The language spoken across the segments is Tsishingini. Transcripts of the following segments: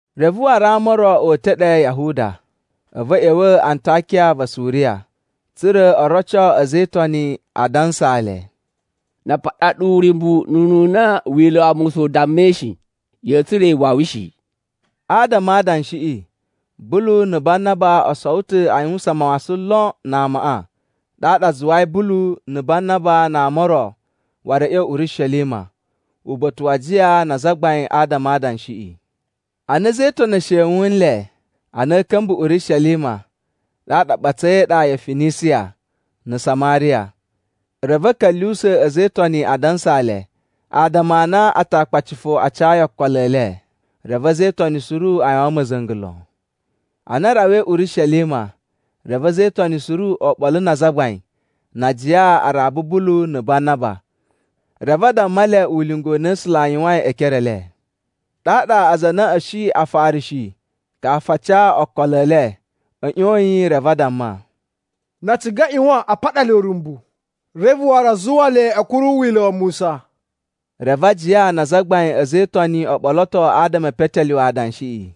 Reve waru ama o ro o uta̱ ɗe Yahuda, a̱vu a̱ ꞌya̱wa̱ Antakiya va Suriya, tsa̱ra̱ o roco a̱za̱ e Itoni, a dansaa le, “Na a paɗa ɗu uryumbu ununa Wila̱ wa Musa u dammai shi, ya̱a̱ tsura̱ iwawi shi.” Adama a adanshiꞌi Bulu na̱ Banaba o sowo ta̱ a yuwusan mawasan lon na amaꞌa. Ɗaɗa a zuwai Bulu na̱ Banaba na ama o ro waru a̱ ꞌya̱wa̱ Urishelima uba̱ta̱ wa ajiya na azagbain adama a adanshiꞌi. Ana a̱za̱ e Itoni e shewun nle, ana a̱a̱ ka̱mba̱ Urishelima, ɗaɗa a ɓatsai e iɗa ya Finisiya na̱ Samariya. Reve a̱ ka̱lyuwusa̱ a̱za̱ e Itoni a dansaa le adama a na Atakpaci fo a cayi okolo e le. Reve a̱za̱ e Itoni suru a yuwan ma̱za̱nga̱ lon. Ana a rawai Urishelima, reve a̱za̱ e Itoni suru oɓolo na azagbain na ajiya a raba Bulu na̱ Banaba. Reve a damma le ulinga u na A̱sula̱ a yuwain e ekere e le. Ɗaɗa aza a na a̱ shi Afarishi kafu a ca okolo e le, a̱ ꞌyoyin reve a damma, “Na a ciga a ꞌyuwan a paɗa le uryumbu, reve waru a zuwa le a̱ kuru Wila̱ wa Musa.” Reve ajiya na azagbain a̱ a̱za̱ e Itoni o ɓoloto adama e petelyuwe adanshiꞌi.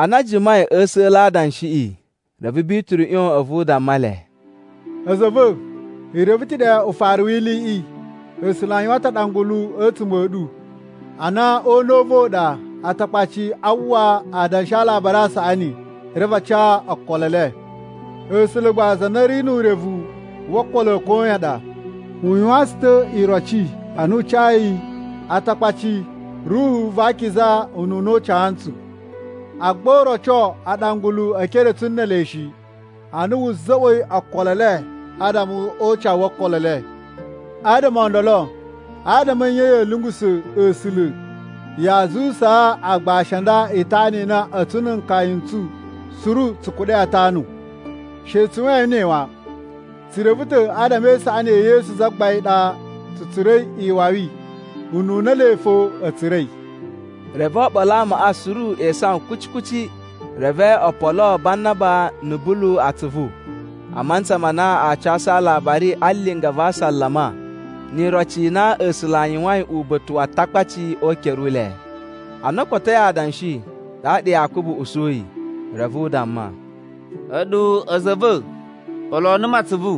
Ana a jimai a̱ a̱sa̱la̱ a adanshiꞌi, reve Bituru ꞌyon a̱vu u damma le, “A̱za̱ a̱ va̱, i reve ta̱ ɗe ufaru wi iliꞌi, A̱sula̱ a yuwan ta̱ aɗangulu a̱tsuma̱ a̱ ɗu, a na o una̱ u va̱ u ɗa Atakpaci aa uwwa adanshi a Alabari a Saꞌani, reve a ca okolo e le. A̱sula̱ gba za na ri nu urevu wo okolo a̱ koyan ɗa, u yuwaan tsu ta̱ iroci a na u cayi Atakpaci Ruhu va Akiza ununa u ca ntsu. Agba u roco aɗangulu e ekere a̱ tsu ne ele shi, ana wu za̱za̱ꞌwa̱i okolo e le adama o ucawu wo okolo e le. Adama o ndolo, adama a̱ nye ya̱a̱ lyungusa̱ A̱sula̱ yaa zuwusaa agbashi a nda itana i na a̱tsu na̱ nkaya n tsu suru tsu kuɗa̱i a tanu? She tsu yuwain ne wan, tsu reve ta̱ adama e isaꞌani ya̱ Yesu Zagbain i ɗa tsu tsura̱i iwawi ununa ele fo a̱ tsura̱i.” Reve oɓolo a amaꞌa suru e isawan kuci kuci, reve o poloo Banaba na̱ Bulu atsuvu a mantsa ma na aa casu alabari a linga va asalama ni iroci i na A̱sula̱ a yuwain uba̱ta̱ wa Atakpaci o ukere u le. Ana o kotoi adanshi, ɗaɗa Yakubu usuyi, reve u damma, “A̱ɗu a̱za̱ a̱ va̱ poloo numu atsuvu.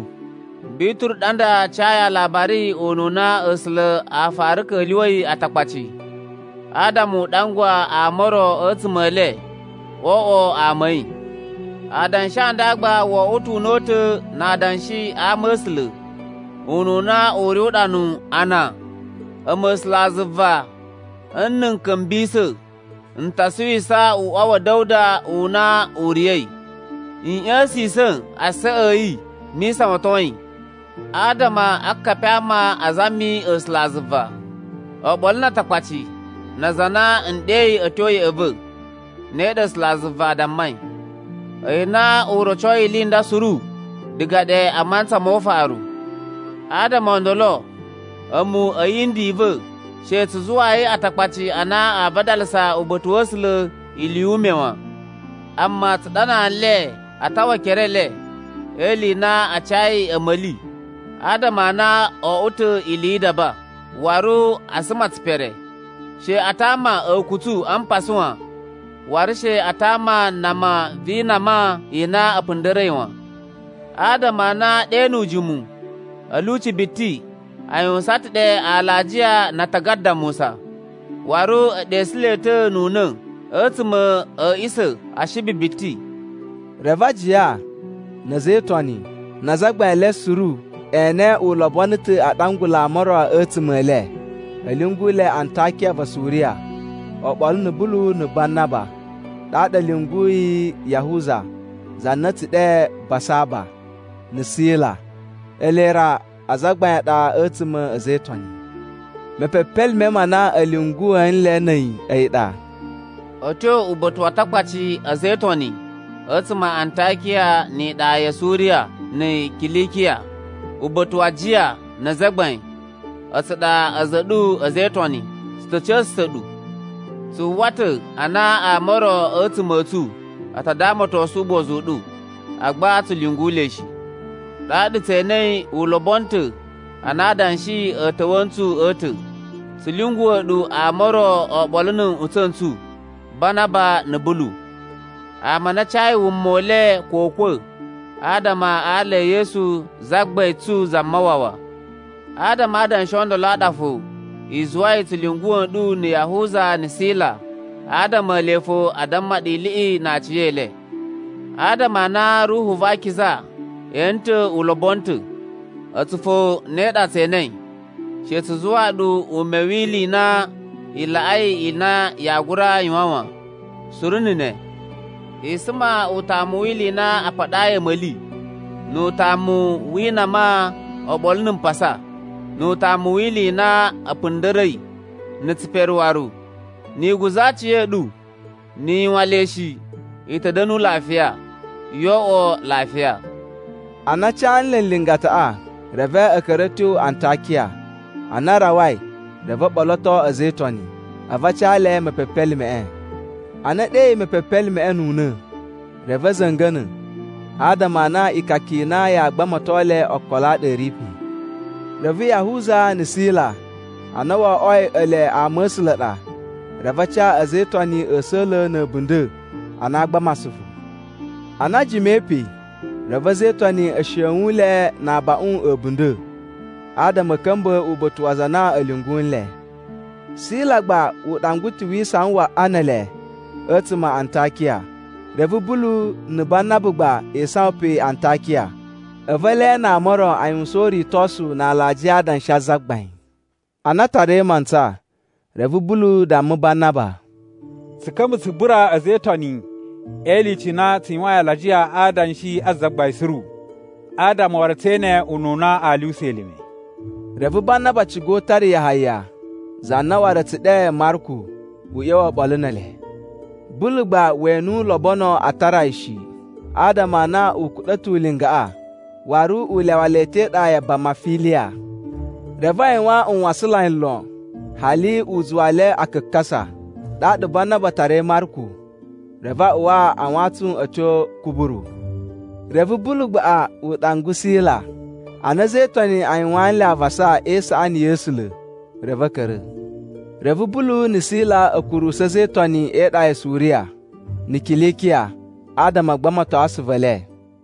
Bituru ɗa nda cayi aalabari ununa A̱sula̱ a fara ka̱lyuwa̱i Atakpaci, adama u ɗangwa ama o ro a̱tsuma̱ e le oo oꞌwo ama a̱ yi. Adanshi a ndaꞌa gba wo oꞌwo ta̱ una̱ta̱ na adanshi a ama̱sula̱, ununa u ri uɗanu a na, ‘A̱mu A̱sulazuva, nna̱ n ka̱mbisa̱, n ta suwisa uꞌwa wa̱ Da̱wuda u na u riya̱i. N ꞌya̱sisa̱n asaꞌa a̱ yi mi isawaton yi. Adama akapi a ama a zami A̱sulazuva, oɓolo na Atakpaci na aza a na n ɗeyi a̱ tyo ya̱ꞌa̱ va̱. Ne ɗa A̱sulazuva a dammai. A̱yi na u rocoi ili i nda suru diga ɗe a mantsa mo ufaru.’ “Adama o ndolo a̱mu a̱ yindi i va̱, she tsu zuwayi Atakpaci a na aa vadalasa uba̱ta̱ wa̱ A̱sula̱ ili yu ume wan. Amma tsu ɗanaa nle a tawa ekere e le e ili i na a cayi a̱ma̱li adama a na o oꞌwo ta̱ ili yi idaba, waru a suma tsipere. She a tama a̱kutsu a mpasa wan. Waru she a tama nama vi inama i na a̱ punda̱ra̱i wan. Adama a na ɗe nu ujimu a̱ lyuci biti a yuwusan ta̱ ɗe alajiya na atagada a Musa, waru e ɗesu le ta̱ nu una̱ a̱tsuma̱ a̱ a̱ꞌisa̱ Ashibi biti.” Reve ajiya, na̱ a̱za̱ e Itoni, na azagbain e le suru e ene u lobono ta̱ a ɗangula ama o ro a̱tsuma̱ e le a̱ lyungu le Antakiya va Suriya oɓolo na̱ Bulu na̱ Banaba. Ɗaɗa a̱ lyunguyi Yahuza (za na a̱ tsu ɗe Basaba) na̱ Sila. Ele ra azagbain a ɗa a̱tsuma̱ a̱ a̱za̱ e Itoni. Mepepelime ma na a̱ lyunguwa̱ nle na̱ a̱yi, a̱yi ɗa: “A̱ tyo uba̱ta̱ wa Atakpaci a̱za̱ e Itoni a̱tsuma̱ a Antakiya ni iɗa ya Suriya na̱ Kilikiya. “Uba̱ta̱ wa ajiya na azagbain, a̱tsu ɗa a̱za̱ a̱ ɗu a̱ a̱za̱ e Itoni. “Tsu ta̱ ca̱sa̱sa̱ ɗu. “Tsu uwwa ta̱ a na ama o ro a̱tsuma̱ a̱ tsu a ta damatosun ugbozu u ɗu, agba tsu lyungu le shi. Ɗaɗa tse enei u lobono ta̱ ana adanshi a̱ ta̱wa̱ ntsu a̱ ta̱, tsu lyunguwa̱ ɗu ama o ro oɓolo na̱ nꞌutsa̱ n tsu Banaba na̱ Bulu. Ama a na a cayi wuma u le ko ukwa̱, adama a ala e Yesu Zagbain tsu Zamawawa. Adama a adanshi o ndolo a ɗa fo i zuwai tsu lyunguwa̱ nɗu na̱ Yahuza na̱ Sila adama ele fo a damma ɗu iliꞌi na aciyele. Adama a na Ruhu va Akiza ene ta̱ u lobono ta̱, a̱tsu fo ne ɗa tse enei, she tsu zuwaa ɗu ume wi ili i na i laꞌai ili i na yaa gura yuwan wan, suru na̱ ne: I suma utamu wi ili i na a paɗayi a̱ma̱li, nu utamu wi inama oɓolo na̱ mpasa, nu utamu wi ili i na a̱ punda̱ra̱i, na̱ tsipere waru. Ni i guza̱ aciya̱ɗu, ni i yuwan le shi, i ta̱ da̱nu lafiya. “Yo oꞌwo lafiya.” Ana a ca nle lingataꞌa, reve a̱ ka̱ra̱ a̱ tyo Antakiya, ana a rawai reve o ɓoloto a̱za̱ e Itoni, a̱vu a ca le mepepelimeꞌe. Ana e ɗeyi mepepelimeꞌe nu una̱, reve a̱ za̱nga̱na̱ adama a na ikaka i na yaa gbamato le okolo a ɗa a̱ ri pe. Reve Yahuza na̱ Sila a na wo oꞌwoi ele ama̱sula̱ a ɗa, reve a ca a̱za̱ e Itoni a̱sa̱la̱ na̱ a̱bunda̱ a na aa gbama asuvu. Ana a jimai pe reve a̱za̱ e Itoni e shewun le na abaꞌun a̱ a̱bunda̱, adama a̱ ka̱mba̱ uba̱ta̱ wa aza a na a̱ lyungu nle. [ Sila gba u ɗangwa ta̱ wi isawan waꞌa ne ele a̱tsuma̱ a Antakiya.] Reve Bulu na̱ Banaba gbaꞌa e isawan pe Antakiya, a̱vu ele na ama o ro aa yuwusan uritosu na alajiya a adanshi a Zagbain. Ana a tarai mantsa, reve Bulu damma Banaba, “Tsu ka̱mba̱ tsu bura a̱za̱ e Itoni e ilyuci i na tsu yuwain alajiya a adanshi a Zagbain suru. Adama waru tse ene ununa aa lyuwusa elime.” Reve Banaba ciga u tara Yahaya za na waru a̱ tsu ɗe Marku u ꞌya̱wa̱ oɓolo ne ele. Bulu gba we ene u lobono a tara yi shi, adama a na u kuɗa̱ ta̱ ulingaꞌa waru u lyawa le ta̱ e iɗa ya Bamafiliya. Reve a yuwan nwasanlai lon, hali u zuwa le a kakasa. Ɗaɗa Banaba tarai Marku, reve a uwa a wantsun a̱ tyo Kuburu. Reve Bulu gbaꞌa u ɗangwa Sila. Ana a̱za̱ e Itoni a yuwaan nle avasa e isaꞌani ya̱ A̱sula̱, reve a̱ ka̱ra̱. Reve Bulu na̱ Sila a̱ kurusu a̱za̱ e Itoni e iɗa ya Suriya na̱ Kilikiya adama a gbamato asuvu e le.